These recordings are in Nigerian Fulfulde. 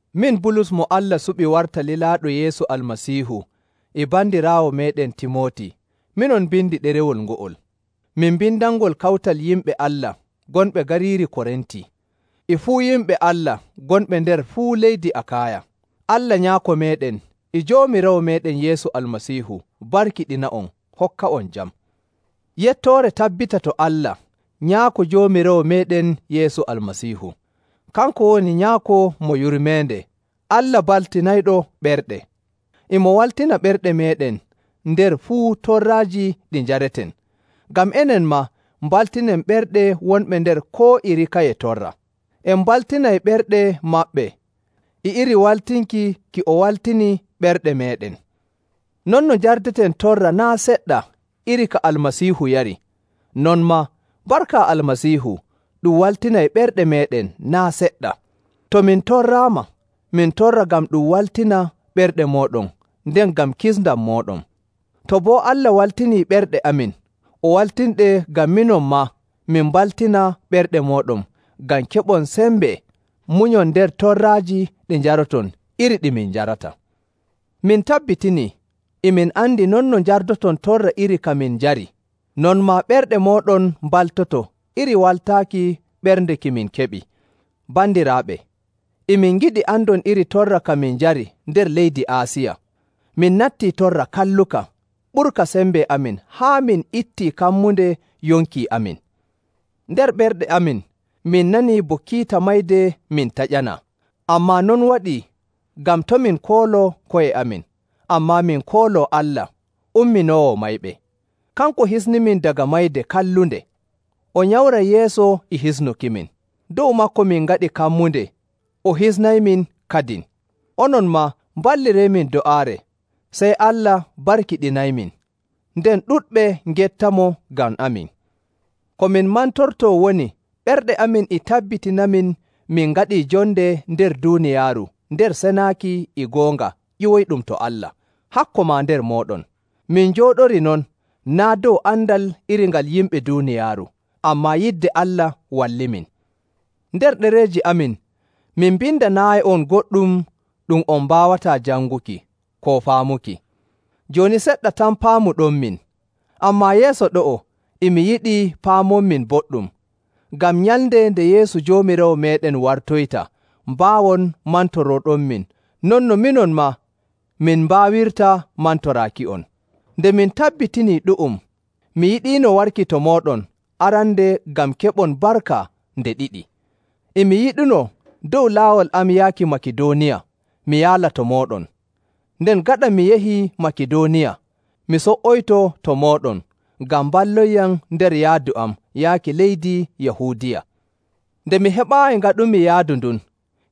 Min Bulus mo Allah suɓi warta lilaaɗo Yeesu Almasiihu e bandiraawo meeɗen Timooti minon mbindi ɗerewol ngo'ol. Min mbindanngol kawtal yimɓe Allah gonɓe gariiri Korinti, e fuu yimɓe Allah gonɓe nder fuu leydi Akaaya. Allah Nyaako meeɗen e Joomiraawo meeɗen Yeesu Almasiihu barkiɗina'on hokka'on jam. Yettoore tabbita to Allah, Nyaako Joomiraawo meeɗen Yeesu Almasiihu. Kanko woni Nyaako mo yurmeende, Allah baltinayɗo ɓerɗe. E mo waltina ɓerɗe meeɗen nder fuu torraaji ɗi njareten, ngam enen maa mbaltinen ɓerɗe wonɓe nder koo iri kaye torra. En mbaltinay ɓerɗe maɓɓe e iri waltinki ki o waltini ɓerɗe meeɗen. Non no njardeten torra naa' seɗɗa iri ka Almasiihu yari, non maa barka Almasiihu ɗum waltinay ɓerɗe meeɗen naa' seɗɗa. To min torraama, min torra ngam ɗum waltina ɓerɗe mooɗon nden ngam kisndam mooɗon. To boo Allah waltinii ɓerɗe amin, o waltinɗe ngam minon maa min mbaltina ɓerɗe mooɗon ngam keɓon sembe munyon nder torraaji ɗi njaroton iri ɗi min njarata. Min tabbitinii, e min andi non no njardoton torra iri ka min njari, non maa ɓerɗe mooɗon mbaltoto iri waltaaki ɓernde ki min keɓi. Bandiraaɓe, e min ngiɗi andon iri torra ka min njari nder leydi Aasiya. Min nattii torra kalluka ɓurka sembe amin haa min ittii kammunde yonki amin. Nder ɓerɗe amin min nanii bo kiita mayde min taƴanaa, ammaa non waɗii ngam to' min kooloo ko'e amin, ammaa min kooloo Allah umminoowo mayɓe. Kanko hisnimin daga mayde kallunde, o nyamray yeeso e hisnukimin. Dow maako min ngaɗi kammunde o hisnaymin kadin. Onon maa mballireemin do'aare, sey Allah barkiɗinaymin, nden ɗuɗɓe ngettamo ngam amin. Ko min mantortoo woni ɓerɗe amin e tabbitinanamin min ngaɗii jonde nder duuniyaaru nder senaaki e goonga ƴiwoyɗum to Allah, hakko maa nder mooɗon. Min njooɗori non naa' dow andal iri ngal yimɓe duuniyaaru, ammaa yidde Allah wallimin. Nder ɗereeji amin min mbindanaayi'on goɗɗum ɗum on mbaawataa janguki koo faamuki. Jooni seɗɗa tan paamuɗonmin, ammaa yeeso ɗo'o e mi yiɗi paamonmin boɗɗum, ngam nyalnde nde Yeesu Joomiraawo meeɗen wartoyta mbaawon mantorooɗonmin non no minon maa min mbaawirta mantoraaki'on. Nde mi tabbitinii ɗu'um, mi yiɗiino warki to mooɗon arande ngam keɓon barka nde ɗiɗi. E mi yiɗunoo dow laawol am yaaki Makidooniya, mi yaala to mooɗon, nden gaɗa mi yahii Makidooniya, mi so''oyto to mooɗon, ngam mballonyam nder yaadu am yaaki leydi Yahuudiya. Nde mi heɓaayi ngaɗumi yaadu ndun,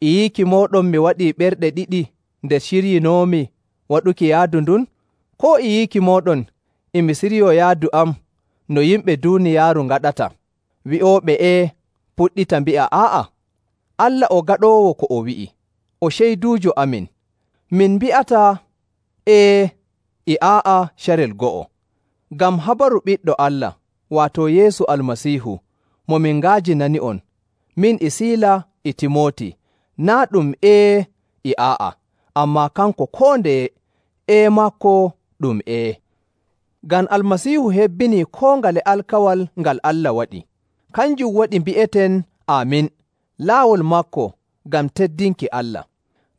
e yiiki mooɗon mi waɗii ɓerɗe ɗiɗi nde ciryinoomi waɗuki yaadu ndun? Koo e yiiki mooɗon e mi siryoo yaadu am no yimɓe duuniyaaru ngaɗata, wi'ooɓe “Ee” puɗɗita mbi'a “Aa'a?” Allah o gaɗoowo ko o wi'i, o ceyduujo amin, min mbi'ataa “Ee” e “Aa'a” carel go'o. Ngam habaru Ɓiɗɗo Allah, waato Yeesu Almasiihu, mo min nga'ajinani'on, min e Siila e Timooti, naa' ɗum “Ee” e “Aa'a,” ammaa kanko koo ndeye “Ee” maako ɗum “Ee.” Ngam Almasiihu hebbinii koo ngale alkawal ngal Allah waɗi. Kanjum waɗi mbi'eten “Aamin” laawol maako ngam teddinki Allah.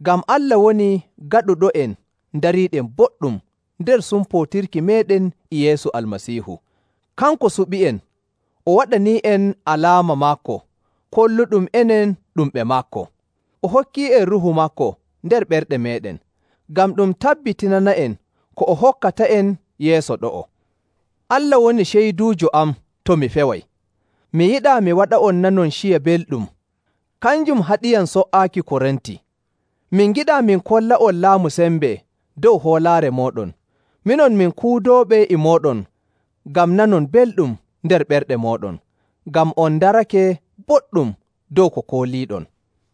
Ngam Allah woni gaɗuɗo'en ndariiɗen boɗɗum nder sumpootirki meeɗen e Yeesu Almasiihu. Kanko suɓi'en, o waɗanii'en alaama maako kolluɗum enen ɗum ɓe maako. O hokkii'en Ruuhu maako nder ɓerɗe meeɗen, ngam ɗum tabbitinana'en ko o hokkata'en yeeso ɗo'o. Allah woni ceyduujo am to mi feway, mi yiɗaa mi waɗa'on nanon ciya belɗum, kanjum haɗiyam so''aaki Korinti. Min ngiɗaa min kolla'on laamu sembe dow hoolaare mooɗon. Minon min kuudooɓe e mooɗon ngam nanon belɗum nder ɓerɗe mooɗon, ngam on ndarake boɗɗum dow ko kooliiɗon.